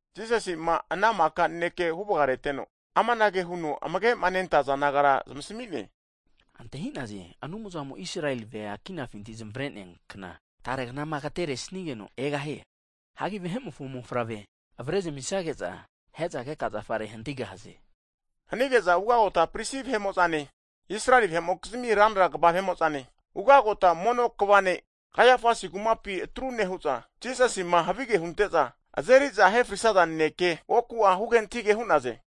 Jisasi'ma ana maka naneke huvgareteno, amanage huno amage'ma nentaza disaipol nagara zmasmi'ne. Antahi'naze Anumzamo Israeli vea kinafinti zmare'nea kna, tare knama agteresigeno egahie. Hagi Vahe'mofo Mofavre avare zamisage'za, ahe'za keka zafare hantigahaze. Hanki ugagota pris vahe'mo'zane, Israeli vahe'mokizmi ranra kva vahe'mo'zane, ugagota mono kva ne' Kaiafasi kumapi atru nehu'za, Jisasima havige hunte'za, azeri'za ahefrisaza naneke, oku'a huge antahige hu'naze.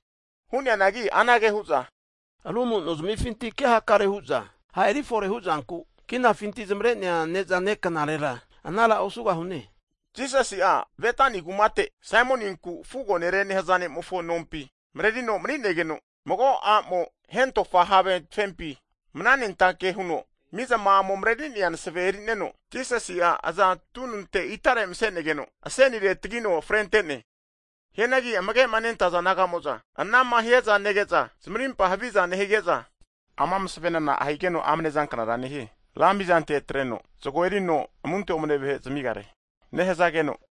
Hu'neanagi anage hu'za aru amu'nozmifinti ke hakare hu'za ha' eri fore hu'zanku kinafinti zmare'nea knagu antahimi'za ne'zane knarera anara osugahune hu'naze. Jisasi'a Betani kumate Saimoninku fugo ne're nehaza nemofo nompi marerino mani'negeno, mago a'mo hentofa have tafempi mananentake huno mizama'amo mareri'nea masave erineno, Jisasi'a aza tununte itare mase'negeno, asenire tagino frente'ne. Hianagi amage'ma nentaza disaipol naga'mo'za, anama hiaza nege'za zmarimpa haviza nehige'za, ama masavena na'a higeno amne zanknara nehie hu'naze? Ra mizante atreno, zago erino amunte omne vahe zamigare nehazageno,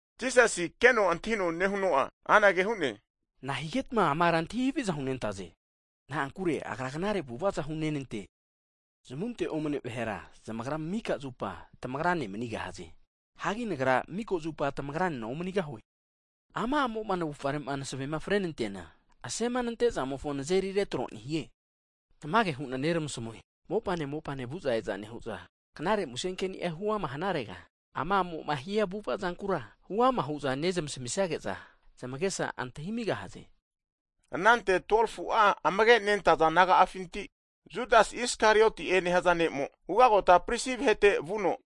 Jisasi keno antahino nehuno'a anage hu'ne, nahigetma ama ara antahi haviza hunentaze? Na'ankure agra knare avu'avaza hunenante. Zamunte omne vahera zamagra mika zupa tamagra ne manigahaze. Hagi Nagra mika zupa tamagra nena omanigahue. Ama a'mo'ma navufare masavema frenenanteana, asemanante'zamofo nazeri retro nehie. Tamage hu'na neramasmue, mopane mopane vu'za e'za nehu'za, knare muse keni'a huama hanarega, ama a'mo hia avu'avazankura huama hu'za vahera nezmasmisage'za, zamagesa antahimigahaze. Anante 12fu'a amage nentaza disaipol naga'afinti Judas Isakarioti'e nehza ne'mo, ugagota prisi vahete vuno,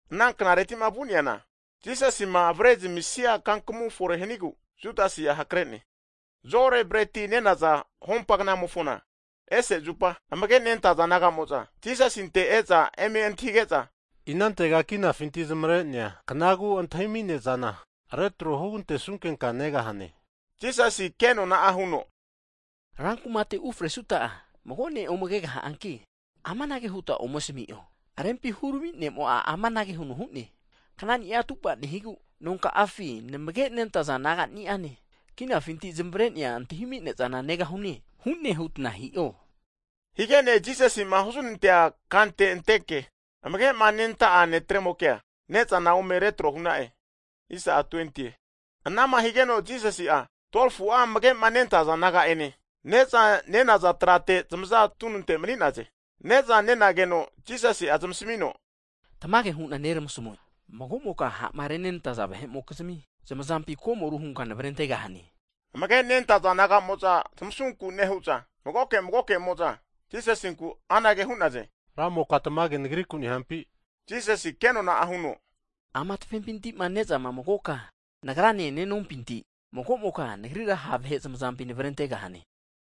Ana knaretima vu'neana Jisasima avare zamisia kankamu fore hanigu Judasi'a hakrene. Zo'ore Breti nenaza hompa knamofona ese zupa, amage nentaza disaipol nagamo'za Jisasinte e'za eme antahige'za, inantega kinafinti zmare'nea knagu antahimi ne'zana retro hugante'sunkenka negahane? Jisasi ke nona'a huno, Rankumate ufresuta'a mago ne' ome kegaha'anki amanage huta ome asami'o, rempi hurami' ne'mo'a amanage huno hu'ne. Knani'a atupa nehigu nonka'afi namage'ma nentaza disaipol nagani'ane kinafinti zmare'nea knagu antahimi ne'zana negahune hune hutna hi'o. Higene Jisasi'ma huznantea kante anteke, amage'ma nenta'a disaipol netremokea ne'zana ome retro hu'na'e. Anama higeno Jisasi'a 12fu'a amage' nentaza disaipol naga'ane neza nenaza trate zmaza tununte mni'naze. Ne'za nenageno Jisasi'a zmasamino, tamage hu'na neramasmue, mago'moka ha'ma renenantaza vahe'mokizmi zmazampi komoru hunka nevrentegahane. Amage'nentaza disaipol naga'mo'za zmusunku nehu'za magoke magokemo'za Jisasinku anage hu'naze, Ramoka tamage nagriku nehampi? Jisasi' kenona'a huno, ama tafepinti'ma ne'zama magoka Nagrane nenompinti, mago'moka nagrira ha' vahe zmazampi navarentegahane.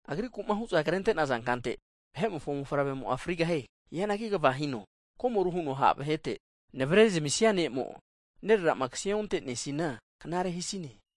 Agriku'ma hu'za krente'naza kante, Vahe'mofo mofavremo frigahie. Hianagi kva hino, komoru huno ha' vahete navre zamisnia ne'mo'a, nerera'ma kse ontene'sinia knare hisine.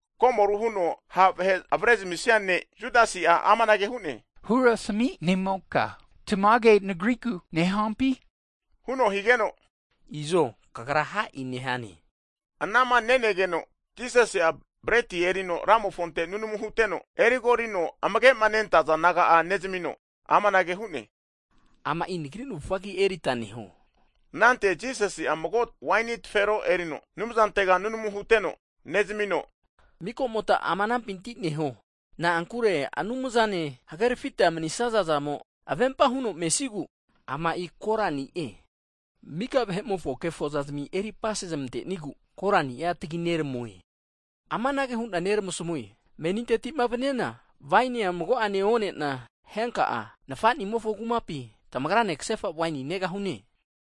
Komoru huno ha' vahe avare zmisia ne' Judasi'a amanage hu'ne, Hurami' ne'moka tamage nagriku nehampi? huno higeno, Izo kagra ha e'i nehane, huno Jisasi'a asmi'ne. Anama nenageno, Jisasi'a breti erino Ramofonte sus huno nunamu huteno, erigorino amage'ma nentaza disaipol naga'a nezmino amanage hu'ne, Ama'i nagri navufgagi erita neho. Anante Jisasi'a mago waini tafero erino Anumzantega susu huno nunamu huteno nezamino, mika'mota ama anampinti neho hu'ne. Na'ankure Anumzane huhagerafita manisnaza'zamo avempa huno mesnigu ama'i korani'e. Mika vahe'mofo kefo zazmi eri apase zmantenigu korani'a tgi neramue. Amanage hu'na neramasmue, Meninteti'ma vniana wainia mago'ene one'na henka'a, Nfa'nimofo kumapi tamagra ne ksefa waini negahune.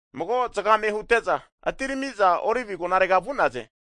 Mago zgame hute'za, atirami'za Olivi agonare vu'naze.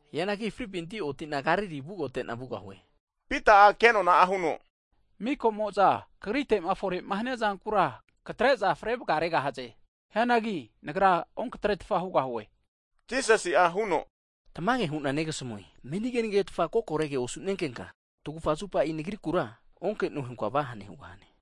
Hianagi fripinti oti'na Galili ugote'na vugahue. Pita'a kenona huno, mikamo'za kagrite'ma fore'ma hania zankura katre'za fre vgaregahaze. Hianagi nagra onkatretfa hugahue. Jisasi'a huno, tamage hu'na negasmue, meni kenegetfa kokorege osu'nenkenka, tagufa zupa Nagrikura onke'noe hunka vahane hugahane.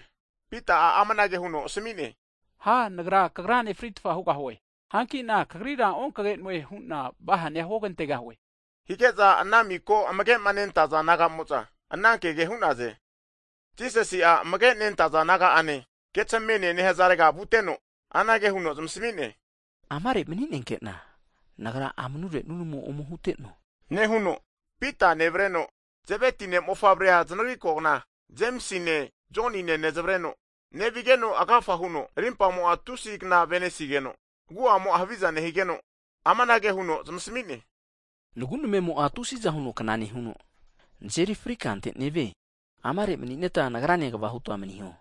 Pita'a amanage huno asmine. Ha nagra Kagrane fritfa hugahue, hanki'na Kagrira okage'noe hu'na vahane huogantegahue. Hige'za ana miko amage'ma nentaza disaipol nagamo'za ana kege hu'naze. Jisasi'a amage nentaza disaipol naga'ene Getsamenie nehzarega vuteno, anage huno zmasami'ne, amare mni'nenkena Nagra amnure nunmu ome huteno nehuno, Pita nevreno Zeveti ne'mofavrea zanagri kogna Jemisine Jonine znavreno nevigeno agafa huno rimpamo tusi kna avenesigeno agu'amo haviza nehigeno, amanage huno zamasmi'ne, nagu namemo'a tusiza huno kna nehuno, nazeri fri kante nevie. Amare mni'neta Nagrane kvahuta maniho.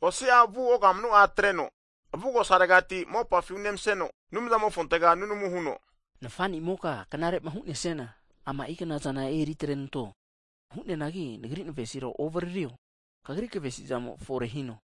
Osi'a vu ogamnu'a atreno avugosaregati mopafi unemaseno, Anumzamofontega nunamu huno, Nfa'nimoka knare'ma hu'nesiana, ama'i knazana eri atrenanto. Hu'neanagi Nagri navesira ovaririo. Kagri kavesizamo forehino.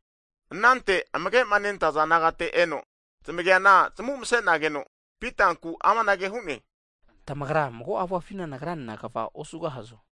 Ananteti amage'ma nentaza disaipol nagate eno, zamageana, zamu mse'nageno, Pitanku amanage hu'ne. Tamagra mago auafina nagranena kva osugahazo?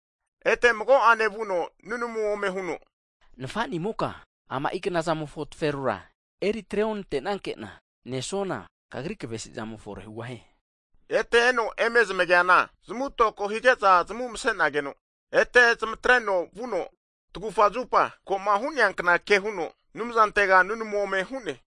Ete mago'ene vuno nunamu ome huno, Nfa'ni moka ama'i knazamofo taferora eri atre onante'nanke'na nesuana, Kagri kvesimo forehugahie. Ete eno eme zamageana zamu toko hige'za zamu mase'nageno, ete zmatreno vuno tagufa zupa ko'ma hu'neankna ke huno Anumzantega nunamu ome hu'ne.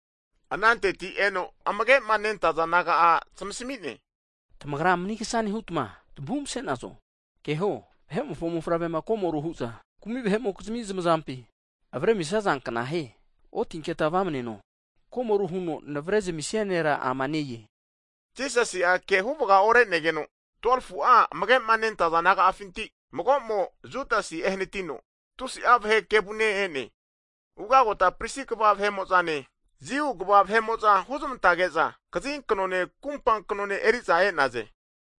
Ananteti eno amage'ma nentaza disaipol naga'a zmasmi'ne, tamagra manigsa nehutma tamu masenazo? Keho, Vahe'mofo mofavrema komoru hu'za kumi vahe'mokizmi zamazampi avremisaza knahie. Otinke' vamneno, komoru huno Navre zamisinie nera ama ne-e. Jisasi'a ke huvga ore'negeno 12fu'a amage'ma nentaza disasipol naga'afinti mago'mo Judasi ehanitino tusi'a vahe kevune e'ne. Ugagota pris kva vahe'mo'zane, Jiu kva vahe'mo'za huzmantage'za kazinknone kumpa knone eri'za e'naze.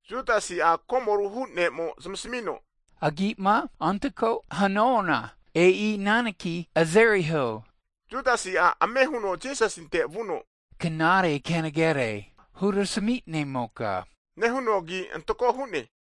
Jutasi'a komoru hu'nemo zamasmino, agi'ma antako hanuana, e'i ana neki azeriho. Judasi'a ame huno Jisasinte vuno knare kenegere hurami Ne'moke nehuno, agi antako hu'ne.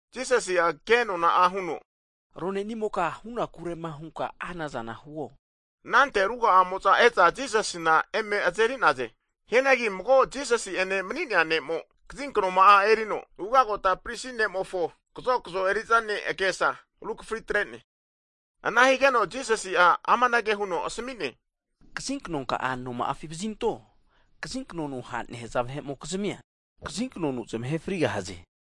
Jisasi'a ke nona'a huno, Rone'nimoka hunakurema hunka anazana huo. Anante ruga'amo'za e'za Jisasina eme azeri'naze. Hianagi mago Jisasi'ene mani'nea ne'mo, kazinknoma'a erino ugagota pris ne'mofo kazokzo eri'za ne' agesa rukafri atre'ne. Ana higeno Jisasi'a amanage huno asmi'ne, kazi knonka'a anoma'afi vazinto. Kazi knonu ha' nehaza vahe'mokizmi'a kazi knonu zamahe frigahaze.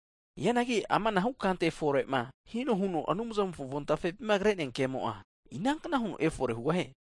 Hianagi amanahu kante fore'ma hino huno Anumzamofo avontafepima kre'nea kemo'a, inankna huno efore hugahie?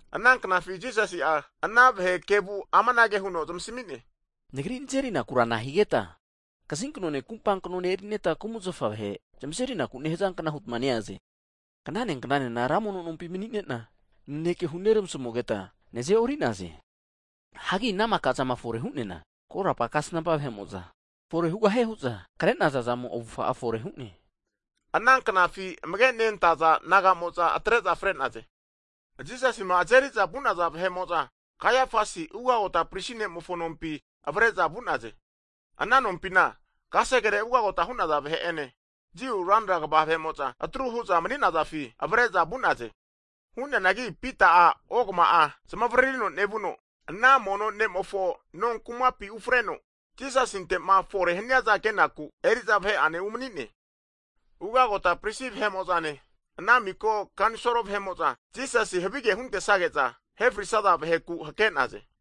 Ana knafi Jisasi'a ana vahe kevu amanage huno zamasmi'ne, Nagri nazerikura nahigeta kazinknone kumpa kno erita kumzafa vahe zamazeriku nehazankna hutma neaze? Knaneknane ra mono nompi mani'ne'na naneke huneramasmugeta naze'ori'naze. Hagi ana maka zama fore hu'neana korapa kasnampa vahe'mo'za, fore hugahie hu'za kre'naza'zamo avufga'a fore hu'ne. Ananknafi amage nentaza disaipol nagamo'za atre'za fre'naze. Jisasima azeri'za vu'naza vahe'mo'za, Kaiafasi ugagota pris nemofo nompi avare'za vu'naze, ana nompina kasegere ugagota hu'naza vahe'ene Jiu ranra kva vahe'mo' za atru hu'za mani'nazafi avare'za vu'naze. Hu'neanagi Pita'a ogama'a zmavaririno nevuno, ana mono ne'mofo no kumapi ufreno, Jisasinte'ma fore haniaza kenaku eri'za vahe'ene umani'ne. Ugagota prisi vahe' mo'zane ana miko kanisol (Senhitren) vahe'mo'za, Jisasi havige huntesage'za ahefrisaza vaheku hakare'naze.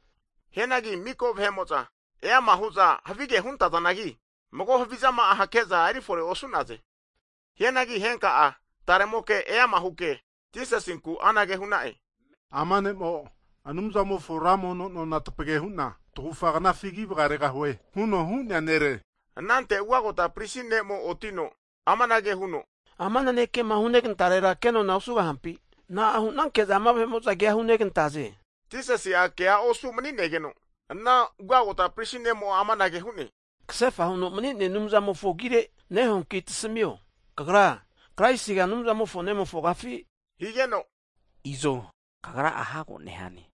Hianagi miko vahe'mo'za eama hu'za havige huntazanagi, mago havizama'a hake'za eri fore osu'naze. Hianagi henka'a taremoke eama huke, Jisasinku anage hu'na'e, Ama ne'mo Anumzamofo ra mono nona tapage hu'na tagufa knafi ki vgaregahue, huno hu'nea nere. Anante ugagota prisi nemo otino amanage huno, Ama nanekema hunegantarera kenona osugahampi? Na'a hu'nanke'za ama vahe'mo'za kea hunegantaze? Jisasi'a ke osu' mani'negeno ana ugagota prisi ne'mo amanage hu'ne, kasefa huno mani'nea Anumzamofo agire nehuanki tasamio. Kagra, Kraisiga Anumzamofo Nemofogafi? higeno, izo Kagraka'a hago nehane.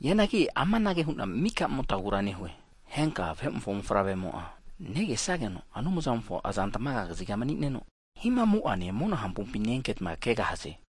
Hianagi amanage hu'na mika motmagura nehue, henka'a Vahe'mofo mofavremo'a, negesnageno Anumzamofo azantmaga kaziga manino hihamu'ane mona hampompi ne-enketa kegahaze.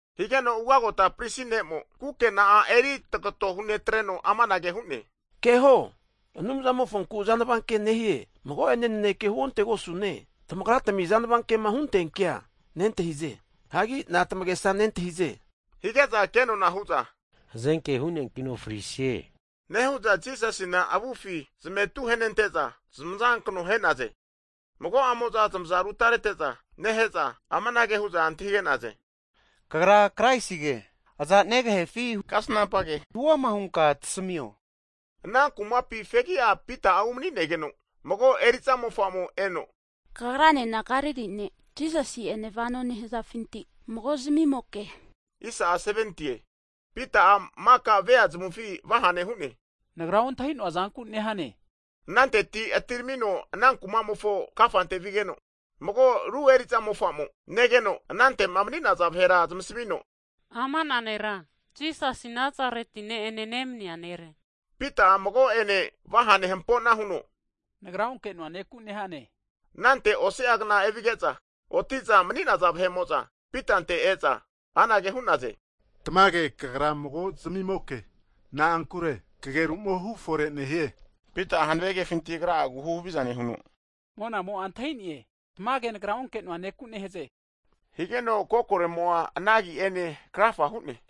Higeno ugagota mono kva ne'mo kukena'a eritagato hunetreno amanage hu'ne, keho Anumzamofonku azanava ke nehie! Mago'ene naneke huontegosune, tamagra tami azanava kema huntea kea nentahize. Hagi na'ane tamagesa nentahize? Hige'za kenona hu'za, hazenke hu'neankino frisie. Nehu'za Jisasina avufi zmetu henente'za zamaza kano ahe'naze. Mago'amo'za zamaza rutarete'za nehe'za, amanage hu'za antahige'naze, kagra Kraisige, aza negahefi kasnampa ke hu'ama hunka tasimio? Ana kumapi fegi'a Pita'a umani'negeno mago eri'za mofa'mo eno, kagranena Galili ne' Jisasi ene vano nehazafinti mago zamimoke, hu'ne. Pita'a maka vea zamufi vahane huno, nagra ontahi'noa zanku nehane. Ananteti atiramino ana kumamofo kafante vigeno, mago ru eriza mofa'mo negeno, anante'ma mani'naza vahera zamasmino, ama nera Jisasi Nazareti ne'ene nemnia nere. Pita'a mago'ene vahane huhampo'na huno, nagra onke'noa neku nehane hu'ne. Anante osi'a kna evige'za, oti'za mani'naza vahe'mo'za Pitante eza, anage hu'naze, tamage kagra mago zamimoke, na'ankure kageru'mo hufore nehie. Pita'a hanave kefinti agra'agu huhaviza nehuno, monamo'a antahine, tamage nagra onke'noa neku nehaze, higeno kokoremo'a ana agi'ene krafa hu'ne.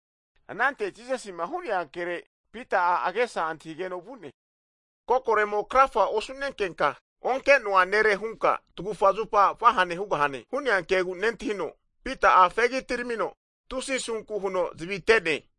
Anante Jisasi'ma hu'nea kere Pita'a agesa antahigeno vu'ne, kokoremo krafa osu'nenkenka onkenoa nere hunka tagufa zupa vahane hugahane hu'nea kegu nentahino, Pita'a fegi atiramino tusi asunku huno zavi ate'ne.